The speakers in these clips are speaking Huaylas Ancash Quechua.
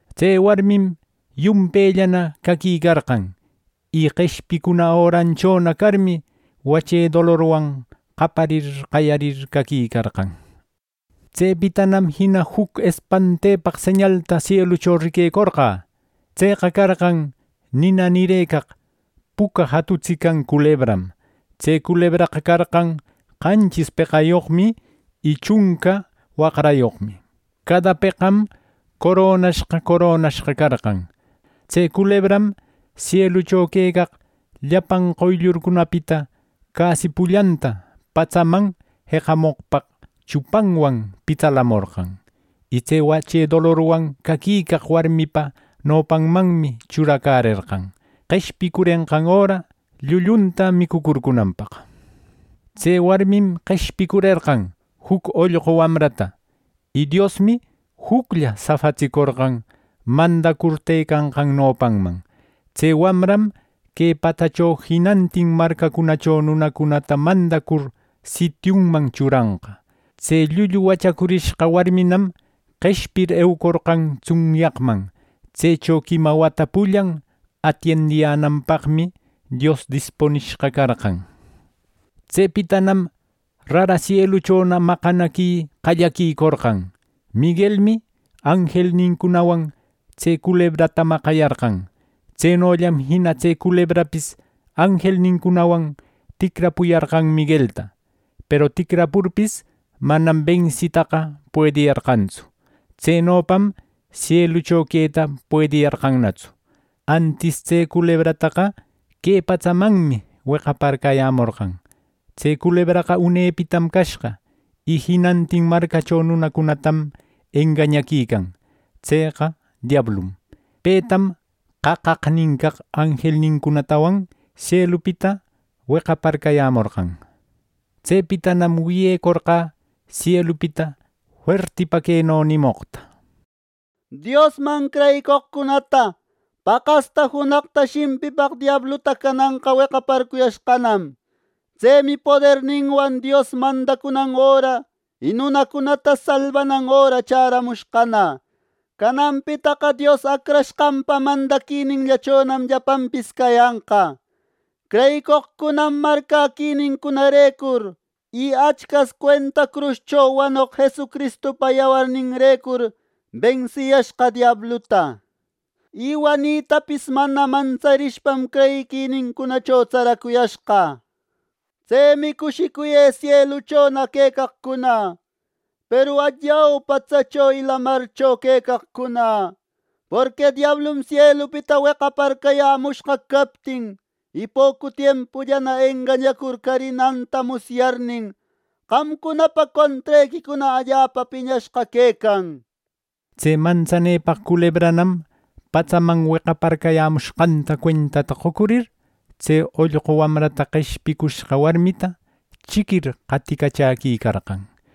Tse warmim yumpellana caquicarqan, y qeshpicuna öranchona carmi, wache dolorwan qaparir qayarir caquicarqan. Tsepitanam jina juc espantepaq señalta sielucho riquecorqä. Tseqa carqan nina nirëcaq puca jatutsican culebram. Tse culebraqa carqan qanchis peqayoqmi y chunca waqrayoqmi. Cada peqam coronashqa coronashqa carqan. Tse culebram sielucho quecaq llapan qoyllurcunapita casi pullanta patsaman jeqamoqpaq chupanwan pitsalamorqan. Y tse wache dolorwan caquicaq warmipa nopanmanmi churacärerqan, qeshpicurenqan öra llullunta micucurcunanpaq. Tse warmim qeshpicurerqan juc ollqu wamrata. Y Diosmi juclla safatsicorqan mandacur tëcanqan nopanman. Tse wamram que patsacho jinantin marcacunacho nunacunata mandar sitiunman churanqa. Tse llullu wachacurishqa warminam qeshpir, eucorqan tsunyaqman. Tsecho quima wata pullan atiendiyänanpaqmi Dios dispunishqa carqan. Tsepitanam rara sieluchona maqanaqui qallaquicorqan. Miguelmi anjelnincunawan tse culebrata maqayarqan. Tsenollam jina tse culebrapis anjelnincunawan ticrapuyarqan Miguelta. Peru ticrapurpis, manam bensitaqa puediyarqantsu. Tsenopam sielucho queta puediyarqannatsu. Antis tse culebrataqa que patsamanmi weqaparcayämorqan. Tse culebraqa unepitam cashqa, y jinantin marcacho nunacunatam engañaquican. Tseqa diablum. Petam qaqaqnin caq anjelnincunatawan sielupita weqaparcayämorqan. Tsepitanam wiyecorqä sielupita fuertipa queno nimoqta: “Diosman creyicoqcunata paqasta junaqta shimpipaq diabluta cananqa weqaparcuyashqanam. Tsemi poderninwan Dios mandacunan öra y nunacunata salbanan öra chäramushqana. Cananpitaqa Dios Acrashqanpa mandaquininllachonam llapanpis cayanqa. Creyicoqcunam marcäquinincunarecur y Achcas cuenta cruscho wanoq Jesucristupa yawarninrecur bensiyashqa diabluta. Y wanitapis mana mantsarishpam, creyiquinincunacho tsaracuyashqa. Tsemi ¡Cushicuyë sieluchona quecaqcuna! ¡Peru allau patsacho y lamarcho quecaqcuna, porqui diablum sielupita weqaparcayämushqa captin, y pocu tiempullana engañacur carinanta musyarnin, qamcunapa contrequicuna allapa piñashqa quecan!” nir. Tse mantsanepaq culebranam patsaman wecaparcayämushqanta cuentata qocuicur tse ollqu wamrata qeshpicushqa warmita chiquir qaticachäquicarqan.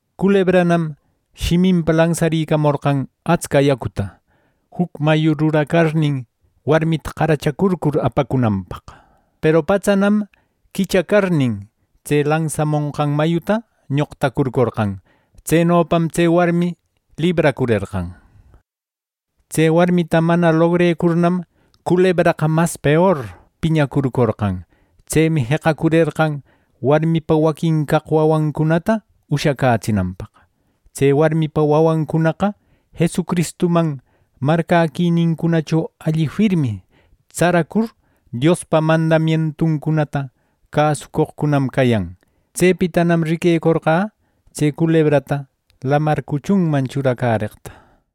Culebranam shiminpa lansaricamorqan atsca yacuta, juc mayu ruracarnin warmita qaracharcur apacunanpaq. Peru patsanam quichacarnin, tse lansamonqan mayuta ñoqtacurcorqan. Tsenopam tse warmi libracurerqan. Tse warmita mana lobrecurnam culebraqa mas peor piñacurcorqan. Tsemi jeqacurerqan warmipa waquin caq wamrancunata ushacätsinanpaq. Tse warmipa wawancunaqa Jesucristuman marcäquinincunacho alli firmi tsaracur, Diospa mandamientuncunata cäsucoqcunam cayan. Tsepitanam ˻riquecurqä˼ tse culebrata lamar cuchunman churacäreqta.